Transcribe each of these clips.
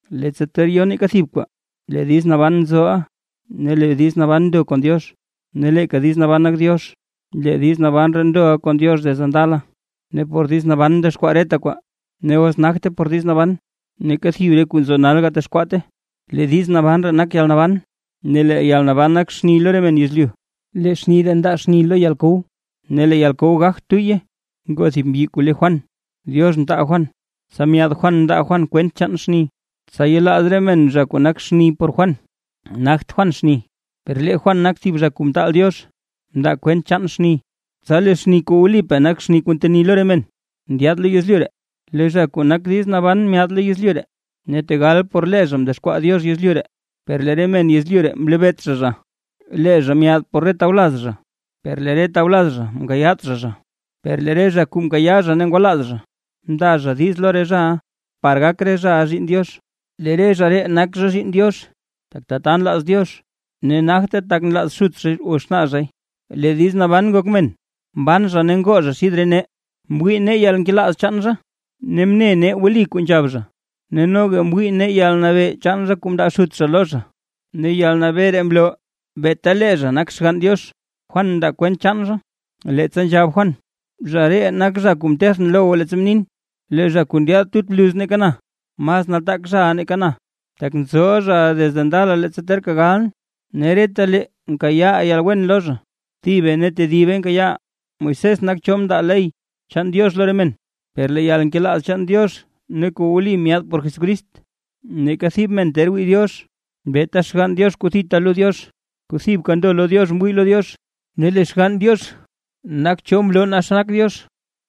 Leettsa ter yo neeka thib kwaa, lee diiz naban nzoʼa, ne lee diiz naban ndo kon Diox, ne leeka diiz naban nak Diox. Lee diiz naban ree ndoʼa kon Diox desde ndala. Ne por diiz naban mdexkwaa reta kwaa, ne os nagte por diiz naban neeka thib re kuu nzo nal gatexkwaate. Lee diiz naban ree nak yalnaban, ne lee yalnaban nak xni lo re men yezlyu. Lee xni ree ndaa xni lo yalkow, ne lee yalkow gagt tuyye. Ngoo thib mbyi kuu le Juan, Diox mtaal Juan, tsa myaad Juan par mndaa Juan kwent chaan xni, tsa yelaaz re men zha kuu nak xni por lee Juan. Nagt Juan xni, per lee Juan nak thib zha kuu mtaal Diox mndaa kwent chaan xni. Tsa lee xni kuu wlipaa nak xni kuu nteni lo re men, ndyaad lo yezlyu ree. Lee zha kuu nak diiz naban myaad lo yezlyu ree, ne tegal por lee zha mdexkwaa Diox yezlyu ree; per lee re men yezlyu ree mlebeet zha zha. Lee zha myaad por re tawlaz zha, per lee re tawlaz zha mkayaat zha zha. Per lee re zha kuu mkayaa zha ne ngwalaaz zha, mndaa zha diiz lo re zhaʼa, par gak re zhaʼa zhiinn Diox. Lee re zha ree nak zha zhiinn Diox, tak tata nlaaz Diox, ne nagte tak nlaaz xut zhay o xnaa zhay. Lee diiz naban ngok men, mban zha ne ngoo zha xid re nee, mwii nee yalnkelaaz chaan zha ne mne nee wli kuu nzhab zha. Ne noga mwii nee yalnabee chaan zha kuu mndaa Xut zha lo zha; ne yalnabee ree mloo beeta lee zha nak Xgann Diox. Juan mndaa kwent chaan zha, leettsa nzhab Juan: ―Zha ree nak zha kuu mtethʼn lo goo leettsa mnin: “Lee zha kuu ndyaad tut bluz nake na, mas nataak zhaʼa nake na, tak nzoʼa zhaʼa desde ndala leettsa terka galʼn”. Ne retalee nkayaaʼaa yalwen lo zha, thibe ne tedibe nkayaaʼaa. Moisés nak cho mndaa ley chaan Diox lo re men, per lee yalnkelaaz chaan Diox ne kuu wli myaad por Jesucrist. Neeka thib men ter wii Diox, beeta Xgann Diox kuu thita lo Diox, kuu thibka ndo lo Diox mwii lo Diox, ne lee Xgann Diox nak cho mloo naa xa nak Diox.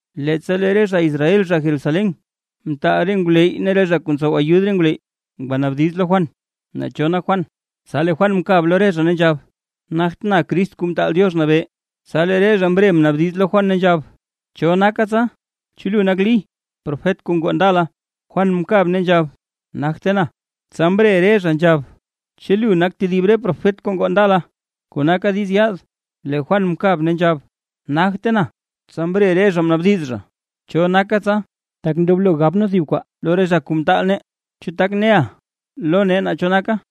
Leettsa lee re zha Israel zha Jerusalén, mtaal re ngwleyy ne re zha kuu ntsow ayud re ngwleyy ngwanaabdiz lo Juan, naa cho nak Juan. Tsa lee Juan mkab lo re zha, ne nzhab Juan: ―Nagtʼn Crist Kuu Mtaal Diox Nabee. Tsa lee re zha mre mnaabdiz lo Juan, ne nzhab: ―¿Cho naka tsa? ¿Chu lu nak Lí, profet kuu ngoo ndala? Juan mkab ne nzhab: ―Nagte na. Tsa mre re zha nzhab: ―¿Chu lu nak tedib re profet kuu ngoo ndala, kuu naka diiz yaad? Lee Juan mkab ne nzhab: ―Nagte na. Tsa mre re zha mnaabdiz zha: ―¿Cho naka tsa? Tak ndoblo gab nee thib kwaa lo re zha kuu mtaal nee. ¿Chu tak neʼa lo nee naa cho naka?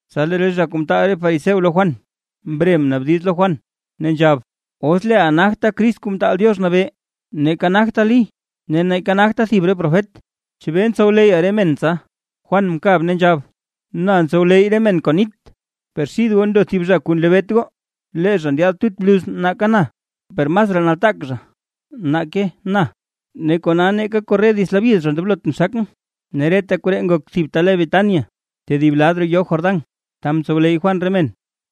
Tsa lee re zha kuu mtaal re fariseo lo Juan, mre mnaabdiz lo Juan, ne nzhab: ―Os leeʼa nagta Crist Kuu Mtaal Diox Nabee, neeka nagta Lí, ne neeka nagta thib re profet, ¿chebee ntsowleyya re men tsa? Juan mkab, ne nzhab: ―Na ntsowleyy re men kon nit, per xid goo ndo thib zha kuu nlebeet goo, lee zha ndyaad tut bluz nake na, per masraa nataak zha nake na, ne kona neeka korre dits labyid zha ndoblotʼn xakʼn. Ne reta koree ngok thib ta le Betania, tedib lad roo yoo Jordán, ta mtsowleyy Juan re men.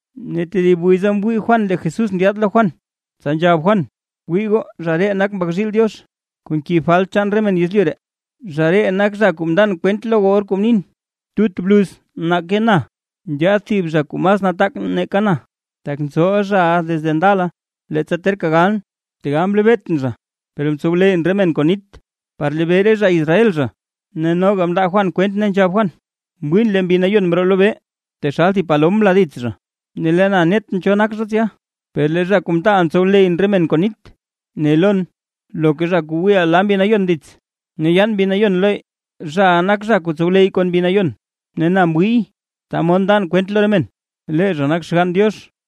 Ne lee tedib wiza mwii Juan lee Jesús ndyaad lo Juan, tsa nzhab Juan: ―¡Wii goo, zha ree nak Mbak zhiil Diox, kuu nkib falt chaan re men yezlyu ree! Zha ree nak zha kuu mndan kwent lo goo or kuu mnin: “Tut bluz nake na ndyaad thib zha kuu mas nataak nake na, tak nzoʼa zha desde ndala leettsa terka galʼn”. Tegal mlebeetʼn zha, per mtsowleyyʼn re men kon nit, par lebee re zha Israel zha. Ne noga mndaa Juan kwent ne nzhab Juan: ―Mwiin lee Mbi Nayon mroo lobee taxal thib palom mla dits zha. Ne lee na netʼn cho nak zha tsya. Per lee zha kuu mtaalʼn tsowleyyʼn re men kon nit, ne lon: “Loka zha kuu wiiʼa la Mbi Nayon dits ne yaan Mbi Nayon lo, zhaʼa nak zha kuu tsowleyy kon Mbi Nayon”. Ne na mwiiy, ta mod ndan kwent lo re men, lee zha nak Xgann Diox.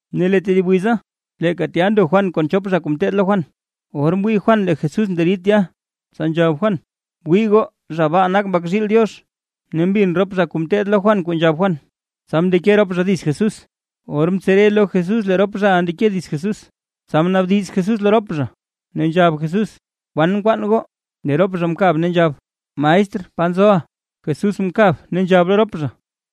Ne lee tedib wiza, leeka tya ndo Juan kon chop zha kuu ngeteed lo Juan. Or mwii Juan lee Jesús nderid tya, tsa nzhab Juan: ―¡Wii goo, zha baa nak, Mbak zhiil Diox! Ne mbin rop zha kuu ngeteed lo Juan kuu nzhab Juan, tsa mndeke rop zha dits Jesús. Or mtsere lo Jesús lee rop zhaʼa ndeke dits Jesús, tsa mnaabdiz Jesús lo rop zha, ne nzhab Jesús: ―¿Kwan nkwaan goo? Lee rop zha mkab ne nzhab: ―Maestr, ¿pa nzoʼa? Jesús mkab ne nzhab lo rop zha: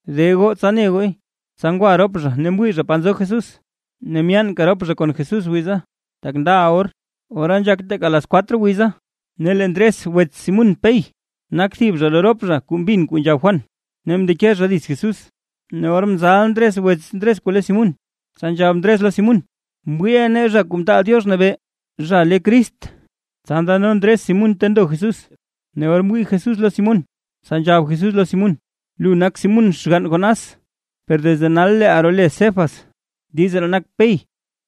―De goo, tsa ne gooy. Tsa ngwa rop zha, ne mwii zha pa nzo Jesús, ne myaanka rop zha kon Jesús wiza, tak ndaʼa or, ora nzhak teeka las cuatro wiza. Ne lee Ndres wets Simún Pey, nak thib zha lo rop zha kuu mbin kuu nzhab Juan, ne mndeke zha dits Jesús. Ne or mzal Ndres wets Ndres kuu le Simún, tsa nzhab Ndres lo Simún: ―Mwiiʼa nee Zha Kuu Mtaal Diox Nabee (zha le Crist). Tsa ndano Ndres Simún ta ndo Jesús, ne or mwii Jesús lo Simún, tsa nzhab Jesús lo Simún: ―Lu nak Simún, xgann Jonás, per desde nal leeʼa role Cefas (diiz ree nak “Pey”).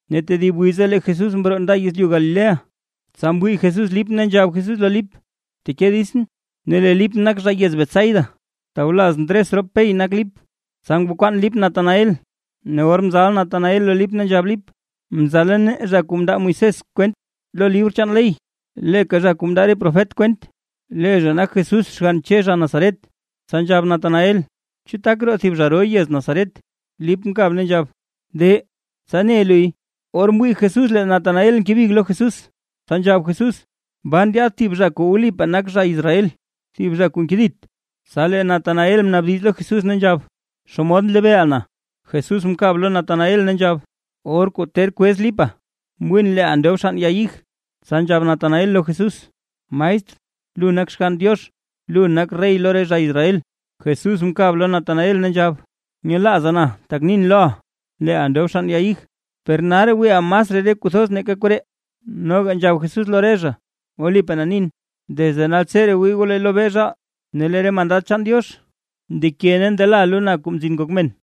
Ne tedib wiza lee Jesús mroo nda yezlyu Galilea. Tsa mwii Jesús Lip ne nzhab Jesús lo Lip: ―Bteke ditsʼn. Ne lee Lip nak zha yez Betsaida, tawlaz Ndres rop Pey nak Lip. Tsa ngwakwaan Lip Natanael, ne or mzal Natanael lo Lip, nzhab Lip: ―Mzala nee zha kuu mndaa Moisés kwent lo libr chaan ley, leeka zha kuu mndaa re profet kwent. Lee zha nak Jesús xgann Che zha Nazaret. Tsa nzhab Natanael: ―¿Chu tak roo thib zha ro yez Nazaret? Lip mkab ne nzhab: ―De, tsa ne luy. Or mwii Jesús lee Natanael ngebig lo Jesús, tsa nzhab Jesús: ―Baa ndyaad thib zha kuu wlipaa nak zha Israel, thib zha kuu nkedit. Tsa lee Natanael mnaabdiz lo Jesús ne nzhab: ―¿Xomod nlebeeʼa na? Jesús mkab lo Natanael ne nzhab: ―Or kuu ter kwez Lipa, mwiin leeʼa ndob xann ya ig. Tsa nzhab Natanael lo Jesús: ―Maestr, ¡lu nak Xgann Diox, lu nak rey lo re zha Israel! Jesús mkab lo Natanael, ne nzhab: ―¿Nyelaaza na tak nin loʼa: Leeʼa ndob xann ya ig? Per nalraa wiiʼa masraa re kuu thoz nake koree. Noga nzhab Jesús lo re zha: ―Wlipaa na nin: Desde naltseree wii goo lee lobee zhaal, ne lee re mandad chaan Diox ndeke ne ndela lo na, Kuu Mzin Ngok Men.